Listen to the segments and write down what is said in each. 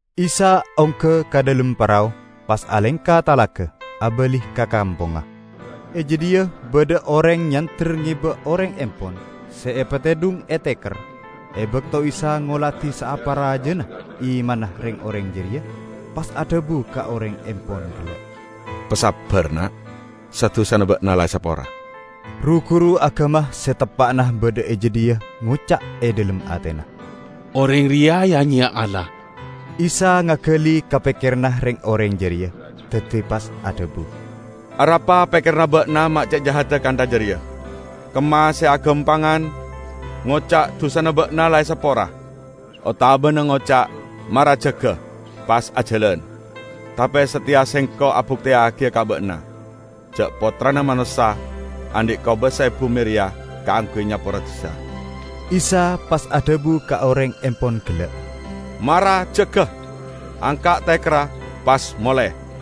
Isa ongga ka dhalem parao, pas alengka talaga, abali ka kampongnga. E jadhiya badha oreng nyander ngeba oreng empon se epatedhung e teker. E bakto Isa ngoladi saapa rajana imanna reng-oreng jareya, pas adhabu ka oreng empon gella', "Pasabbar, na'! Sa-dusana ba'na la esapora." Ru-guru agama se teppa'na badha e jadhiya ngoca' e dhalem atena, "Oreng reya ya-nyeya Allah!" Isa ngagali ka pekkeranna reng-oreng jareya, daddi pas adhabu, "Arapa pekkeranna ba'na me' ce' jahadda kantha jareya? Kemma se agampangan: ngoca', 'Dusana ba'na la esapora', otabana ngoca', 'Mara jaga pas ajalan'? Tape sateya Sengko' abukteyagiya ka ba'na ja' Pottrana Manossa andhi' kobasa e bume reya kaangguy nyapora dusa." Isa pas adhabu ka oreng empon gella', "Mara jaga, angka' tekerra pas mole!"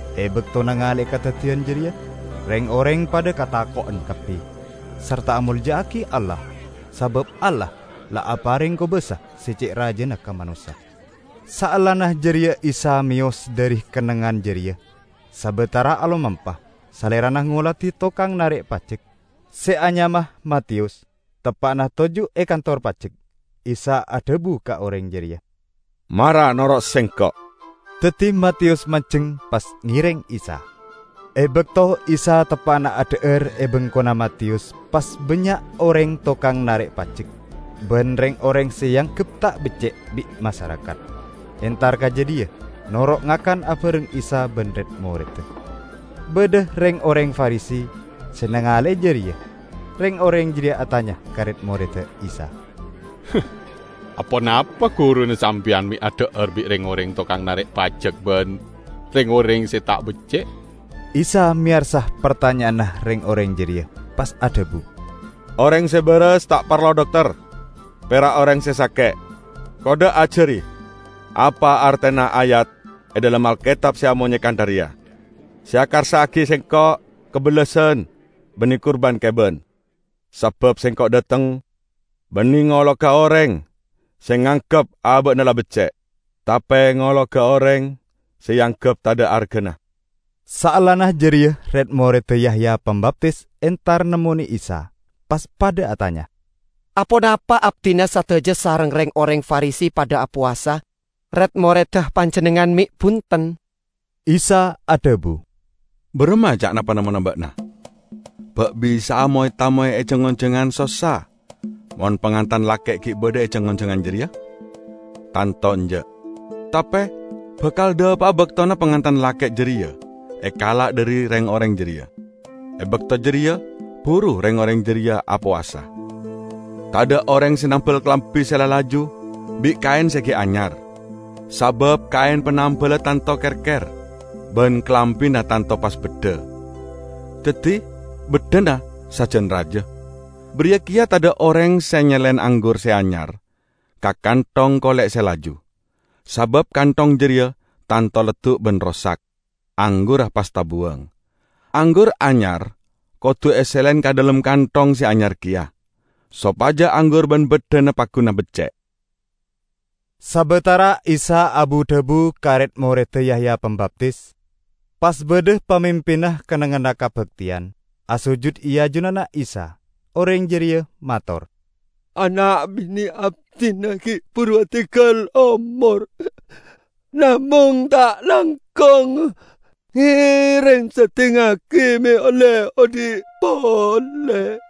E bakto nangale'e kadaddiyan jareya, reng-oreng padha katako'en kabbi sarta amolja'agi Allah, sabab Allah la apareng kobasa se ce' rajana ka manossa. Saellana jareya Isa meyos dhari kennengngan jareya. Sabatara alomampa, Salerana ngoladi tokang narek pajek, se anyama Matiyus, teppa'na toju' e kantor pajek. Isa adhabu ka oreng jareya, "Mara noro' Sengko'!" Daddi Matiyus manjeng pas ngereng Isa. E bakto Isa teppa'na adha'ar e bengkona Matiyus, pas bannya' oreng tokang narek pajek ban reng-oreng se eanggep ta' becce' bi' masarakat, entar ka jadhiya noro' ngakan abareng Isa ban red-moredda. Badha reng-oreng Farisi se nangale'e jareya. Reng-oreng jareya atanya ka red-moredda Isa, "Aponapa guruna sampeyan me' adha'ar bi' reng-oreng tokang narek pajek ban reng-oreng se ta' becce'?" Isa meyarsa partanya'anna reng-oreng jareya pas adhabu, "Oreng se baras ta' parlo dokter, pera' oreng se sake'. Kodda' ajari apa artena ayat e dhalem Alketab se amonye kantha reya: 'Se ekarsa'agi Sengko' kabellasan, banne kurban keban'. Sabab Sengko' dhateng banne ngologa oreng se nganggep aba'na la becce', tape ngologa oreng se eanggep tadha' argana." Saellana jareya red-moredda Yahya Pambaptis entar nemmone Isa, pas padha atanya, "Aponapa abdina sadaja sareng reng-oreng Farisi padha apowasa, red-moredda Panjennengngan me' bunten?" Isa adhabu, "Baramma ca'na panemmona ba'na? Ba' bisa'a moy-tamoy e jang-onjangan sossa mon pangantan lake' gi' badha e jang-onjangan jareya? Tanto enja'! Tape bakal dhapa'a baktona pangantan lake' jareya ekala' dhari reng-oreng jareya. E bakto jareya buru reng-oreng jareya apowasa. Tadha' oreng se nambal kalambi se la laju bi' kaen se gi' anyar. Sabab kaen panambella tanto kerker ban kalambina tanto pas beddha, daddi beddhana sajan raja. Bariya keya tadha' oreng se nyelen anggur se anyar ka kanthong kole' se laju. Sabab kanthong jareya tanto leddu' ban rosak, anggurra pas tabuwang. Anggur anyar kodu selen ka dhalem kanthong se anyar keya, sopaja anggur ban baddhana pagguna becce'." Sabatara Isa abu-dhabu ka red-moredda Yahya Pambaptis, pas badha pamimpinna kennengnganna kabakteyan, asojud e ajunanna Isa. Oreng jareya mator, "Ana' bine' abdina gi' buru adinggal omor. Namong, ta' langkong, ngereng seddingngagi me' olle odhi' pole."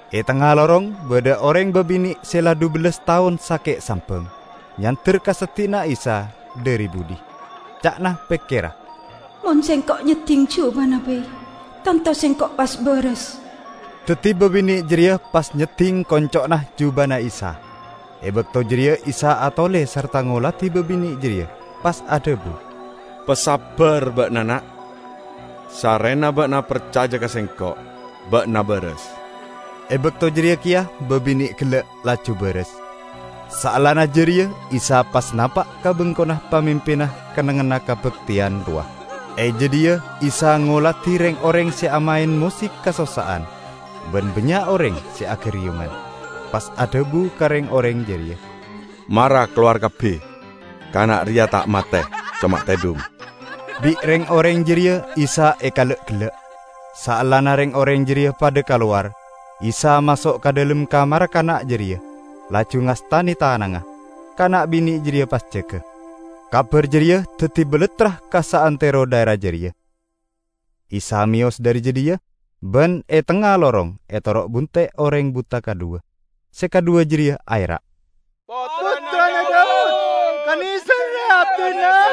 E tengnga lorong badha oreng babine' se la dhubellas taon sake' sambang, nyander ka seddi'na Isa dhari budhi. Ca'na pekkerra, "Mon sengko' nyedding jubana bai, tanto sengko' pas baras." Daddi babine' jareya pas nyedding konco'na jubana Isa. E bakto jareya Isa atole sarta ngoladi babine' jareya pas adhabu, "Pasabbar ba'na, na'! Sarrena ba'na parcaja ka Sengko' ba'na baras!" E bakto jareya keya babine' gella' laju baras. Saellana jareya Isa pas napa' ka bengkona pamimpinna kennengnganna kabakteyan rowa. E jadhiya Isa ngoladi reng-oreng se amaen mosik kasossa'an ban bannya' oreng se agariyungan, pas adhabu ka reng-oreng jareya, "Mara kalowar kabbi! Kana' reya ta' mate; coma tedhung." Bi' reng-oreng jareya Isa ekala'-gella'. Saellana reng-oreng jareya padha kalowar, Isa maso' ka dhalem kamarra kana' jareya, laju ngastane tanangnga. Kana' bine' jareya pas jaga. Kabar jareya daddi balattra ka saantero dhaera jareya. Isa meyos dhari jadhiya ban e tengnga lorong etoro' bunte' oreng buta kadhuwa. Se kadhuwa jareya aera', "Pottrana Daud, kaneserre abdina!"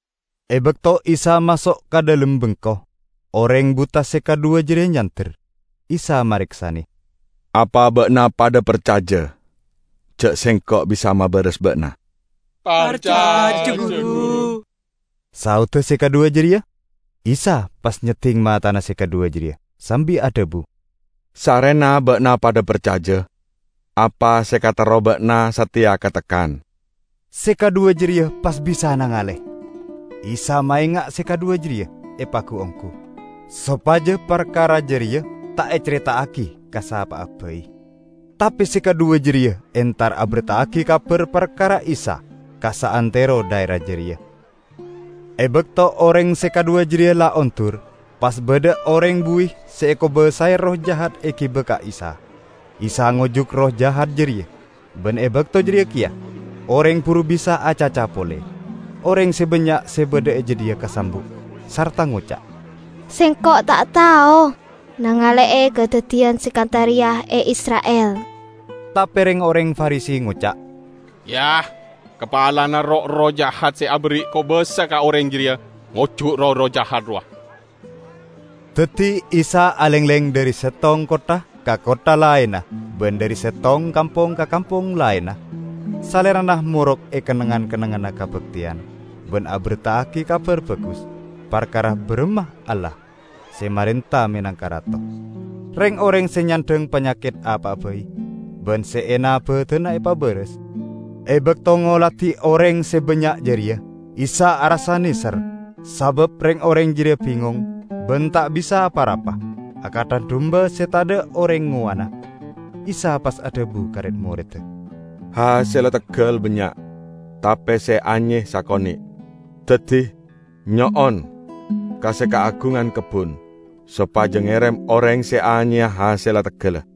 E bakto Isa maso' ka dhalem bengko, oreng buta se kadhuwa jareya nyander. Isa mareksane, "Apa ba'na padha parcaja ja' Sengko' bisa mabaras ba'na?" "Parcaja, Guru!" saodda se kadhuwa jareya. Isa pas nyedding matana se kadhuwa jareya sambi adhabu, "Sarrena ba'na padha parcaja, apa se ekaterro ba'na sateya katekkan." Se kadhuwa jareya pas bisa nangale. Isa maenga' se kadhuwa jareya epagu-onggu, sopaja parkara jareya ta' ecareta'agi ka sapa'a bai. Tape se kadhuwa jareya entar aberta'agi kabar parkara Isa ka saantero dhaera jareya. E bakto oreng se kadhuwa jareya la ondur, pas badha oreng buwi se ekobasae erroh jahat egiba ka Isa. Isa ngojuk erroh jahat jareya ban e bakto jareya keya oreng buru bisa acaca pole. Oreng se bannya' se badha e jadhiya kasambu' sarta ngoca', "Sengko' ta' tao nangale'e kadaddiyan se kantha reya e Isra'il!" Tape reng-oreng Farisi ngoca', "Kapalana roh-erroh jahat se aberri' kobasa ka oreng jareya ngojuk roh-erroh jahat rowa." Daddi Isa alengleng dhari settong kottha ka kottha laenna ban dhari settong kampong ka kampong laenna. Salerana morok e kennengngan-kennengnganna kabakteyan ban aberta'agi Kabar Bagus parkara baramma Allah se marenta menangka Rato. Reng-oreng se nyandhang panyaket apa'a bai ban se ena badanna epabaras. E bakto ngoladi oreng se bannya' jareya, Isa arassa neser, sabab reng-oreng jareya bingong ban ta' bisa apa-rapa, akantha dumba se tadha' oreng ngowanna. Isa pas adhabu ka red-moredda, "Hasella teggal bannya' tape se anye sakone'. Daddi nyo'on ka se kaagungan kebbun sopaja ngerem oreng se anyeya hasella teggalla."